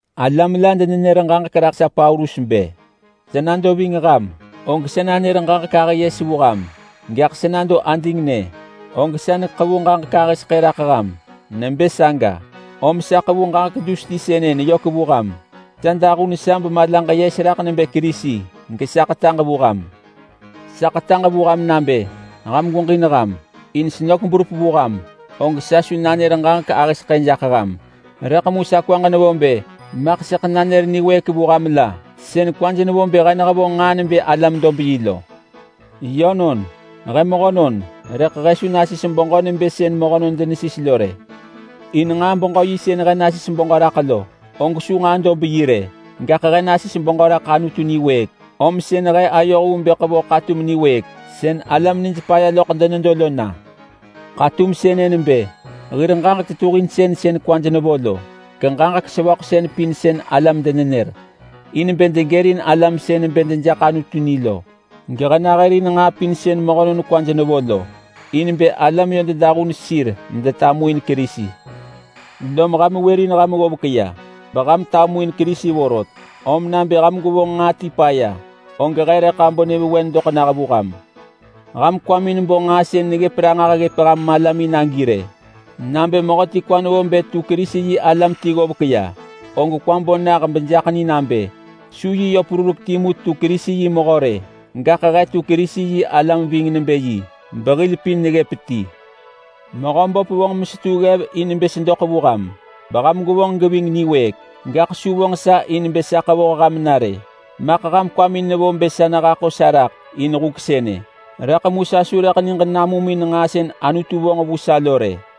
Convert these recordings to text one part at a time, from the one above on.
Alam la denenër ġaġek raḳ sa Paulus bë: Sa nado ving ham, og sa nanër ġaġek ahë yes vu ham, gaḳ sa nado adingnë og sa neḳevu ġaġek ahë seḳë raḳ ham. Nebë saga, om sa ḳevu ġaġek dus ti sënë neyök vu ham. Sa dahun sa bemalaġ yes raḳ nebë Kerisi gesa ḳetaġ vu ham. Sa ḳetaġ vu ham nabë ham gweġin ham in senök berup vu ham, og sa su nanër ġaġek ahë seḳë jaḳ ham. Rëḳ mu sa kwaġ nevo bë maḳ sëḳ nanër niwëëk vu ham la sën kwaj nevo bë he nehevonġ nġaa nebë alam-dob-yi lo. Yönon, he mehönon, rëḳ he su nasis beġö nebë sën mehönon denesis lo rë. In nġaa-beġö-yi sën he nasis beġö raḳ lo, og su nġaa-dob-yi rë. Gaḳ he nasis beġö raḳ Anutu niwëëk, om sën he ayoh vu bë ḳevoh ḳatum niwëëk sën alam nij paya loḳ denedo lo na. Ḳatum sënë nebë hir ġaġek tetuhinsën sën kwaj nevo lo, geġaġek sevöḳsën pin sën alam denenër in bë degërin alam sën bë dejaḳ Anutu ni lo. Gehe nahërin nġaa pin sën mehönon kwaj nevo lo, in bë alam yö dedahun sir medetamuin Kerisi. Lom ham wërin ham ggovek ya beham tamuin Kerisi vorot, om nabë ham gwevonġ nġaa ti paya, og he rëḳ abo nyëvewen doḳ nah vu ham. Ham kwamin bo nġaa sën neggëp ranġah ggëp ham malamin agi rë! Nabë mehöti kwa nevo bë tu Kerisi-yi-alam ti ggovek ya, og kwa bo nah bejaḳ ni nabë su yi perurek timu tu Kerisi yi mehö rë, gaḳ he tu Kerisi-yi-alam ving nebë yi, behil pin neggëp ti. Mehöböp vonġ mesetu ggev in bë sedoḳ vu ham beham gwevonġ geving niwëëk, gaḳ su vonġ sa in bë sa ḳevoh ham na rë. Maḳ ham kwamin nevo bë sa nehaḳo sa raḳ in huk sënë, rëḳ mu sa su rëḳ niġ namum in nġaa sën Anutu vonġ vu sa lo rë.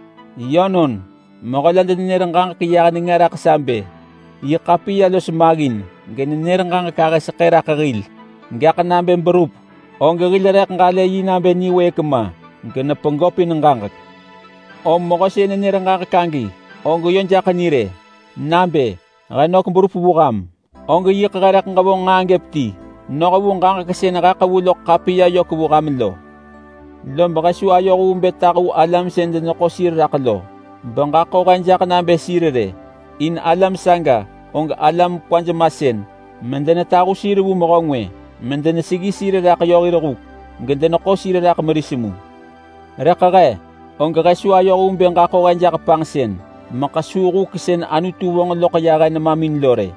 Yönon, mehö la denenër ġaġek yah nenga raḳ sa bë, “Yi ḳapiya los maggin genenër ġaġek ahë seḳë raḳ hil, gaḳ nabë berup og hil rëḳ ġalë yi nabë niwëëk ma genepegöpin ġaġek.” Om mehö sën nenër ġaġek agi, og yö jaḳ ni rë nabë: He nök berup vu ham, og yiḳ he rëḳ ġevonġ nġaa timu noh vu ġaġek sën he neḳevu loḳ ḳapiya vu ham lo. Lob he su ayoh vu bë tahu alam sën deneḳo sir raḳ lo beġaḳo he jaḳ nabë sir rë. In alam saga, og alam kwaj masën medenetahu sir vu mehö ngwë medeneseggi sir raḳ yö hir huk gedeneḳo sir raḳ meris mu. Rëḳ he, og he su ayoh vu bë ġaḳo he jaḳ panġsën mekesuu huk sën Anutu vonġ loḳ he nemamin lo rë.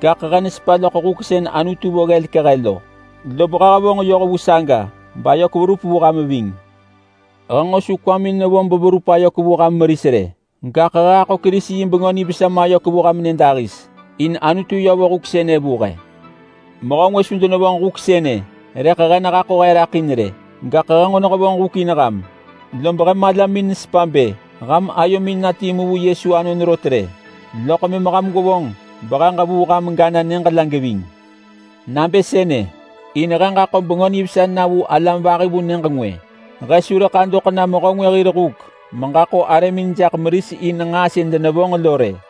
Gaḳ he nesepa loḳ huk sën Anutu vo ggelek he lo, lob he hevonġ yoh vu saga bayök verup vu ham ving. He su nġo kwamin nevo beverup ayök vu ham meris rë, gaḳ he haḳo Kerisi yi Bengö Nivesa mayök vu ham nyëdahis in Anutu yö vo huk sënë vu he. Mehö ngwë su denevonġ huk sënë rëḳ he nehaḳo he raḳ in rë, gaḳ he nġo hevonġ huk in ham. Lob he malamin nesepa bë ham ayomin na timu vu Yesu anon rot rë, loḳ mëm ham gwevonġ behe ġevuu ham gana nyëġ la geving. Nabë sënë in he ġaḳo Bengö Nivesa na vu alam vahi vu nyëġ ngwë. He su rëḳ adoḳ na mehö ngwë hir huk meġaḳo arëmin jaḳ meris in nġaa sën denevonġ lo rë.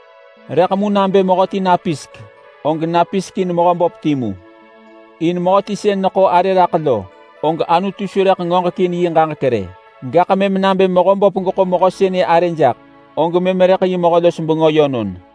Rëḳ mu nabë mehöti napisek, og napisek in Mehöböp timu. In mehöti sën yö neḳo arë raḳ lo, og Anutu su rëḳ ngoġekin yi ġaġek rë. Gaḳ mëm nabë Mehöböp geḳo mehö sënë arë jaḳ, og mëm rëḳ yi mehö-los-bengö yönon.